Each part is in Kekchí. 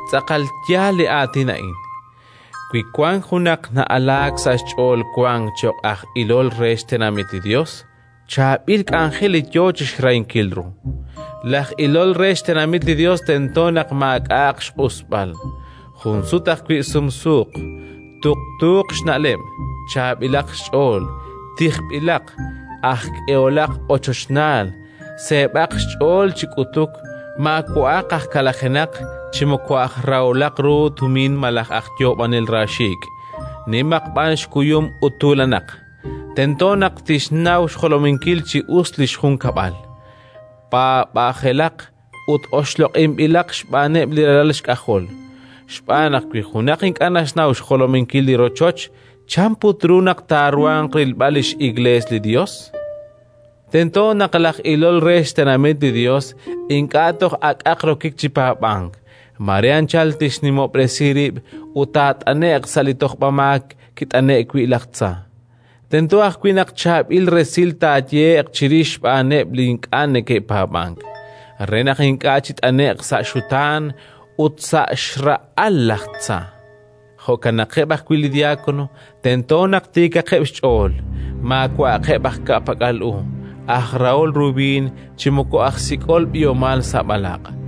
Tz'aqal yaal li aatin a'in: wi wank junaq na'alaak sa' xch'ool wank cho'q aj ilol re xtenamit li Yos, chaab'il k'anjel li yo chi xrahinkil ru. Laj ilol re xtenamit li Yos tento naq maak'a'aq xq'usb'al, jun sut ajwi' sumsuuq, tuqtuuq xna'leb', chaab'ilaq xch'ool, tijb'ilaq, aj k'eholaq ochochnaal, seeb'aq xch'ool chi k'utuk, maawa'aq aj kalajenaq, chi moko aj raholaq ru tumin malaj aj yoob'anel raaxiik', nimaq b'an xkuyum ut tuulanaq. Tento naq tixnaw xjolominkil chi us li xjunkab'al, paab'ajelaq ut oxloq'inb'ilaq xb'aaneb' li ralal xk'ajol, xb'aan naq wi junaq ink'a' naxnaw xjolominkil li rochoch, chan put ru naq taaruhanq rilb'al li x'Iklees li Yos? Tento naq laj ilol re xtenamit li Yos ink'a' toj akaq rokik chi paab'ank: mare anchal tixnimob'resi rib' ut taat'ane'q sa' li tojb'amaak kit'ane'k wi' laj tza. Tento ajwi' naq chaab'il resil taayehe'q chirix xb'aaneb' li ink'a' neke'paab'ank, re naq ink'a' chit'ane'q sa' xutaan ut sa' xra'al laj tza. Jo'kanaqeb' ajwi' li diákono, tento naq tiikaqeb' xch'ool, maawa'aqeb' aj ka'pak'al u, aj rahol ru b'iin chi moko aj sik'ol b'ihomal sa' b'alaq',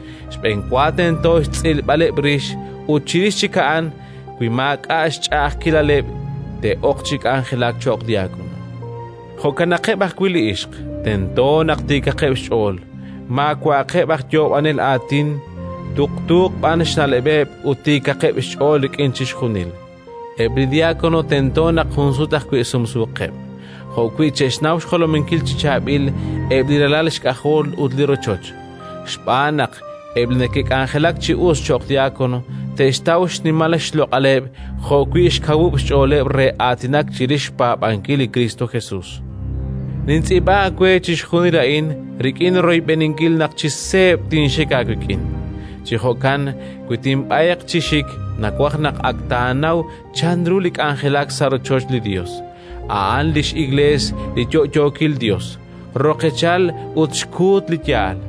Xb'enwa tento xtz'ilb'aleb' rix, ut chirix chik a'an, wi maak'a' xch'a'ajkilaleb', te'ok chi k'anjelak cho'q diákono. Jo'kanaqeb' ajwi' li ixq, tento naq tiikaqeb' xch'ool, maawa'aqeb' aj yoob'anel aatin, tuqtuuq b'an xna'leb'eb' ut tiikaqeb' xch'ool rik'in chixjunil. Eb' li diákono tento naq jun sut ajwi' sumsuuqeb', jo'wi' che'xnaw xjolominkil chi chaab'il eb' li ralal xk'ajol ut li rochoch. Xb'aan naq eb' li neke'k'anjelak chi us cho'q diákono te'xtaw xnimal xloq'aleb' jo'wi' xkawub' xch'ooleb' re aatinak chirix xpaab'ankil li Kristo Jesus. Nintz'iib'a aawe chixjunil a'in, rik'in royb'eninkil naq chi seeb' tinxik aawik'in. Chi jo'kan, wi tinb'ayq chi xik, nawaj naq ak taanaw chanru li k'anjelak sa' rochoch li Yos, a'an li x'Iklees li yo'yookil Yos, roqechal ut xkuut li yaal.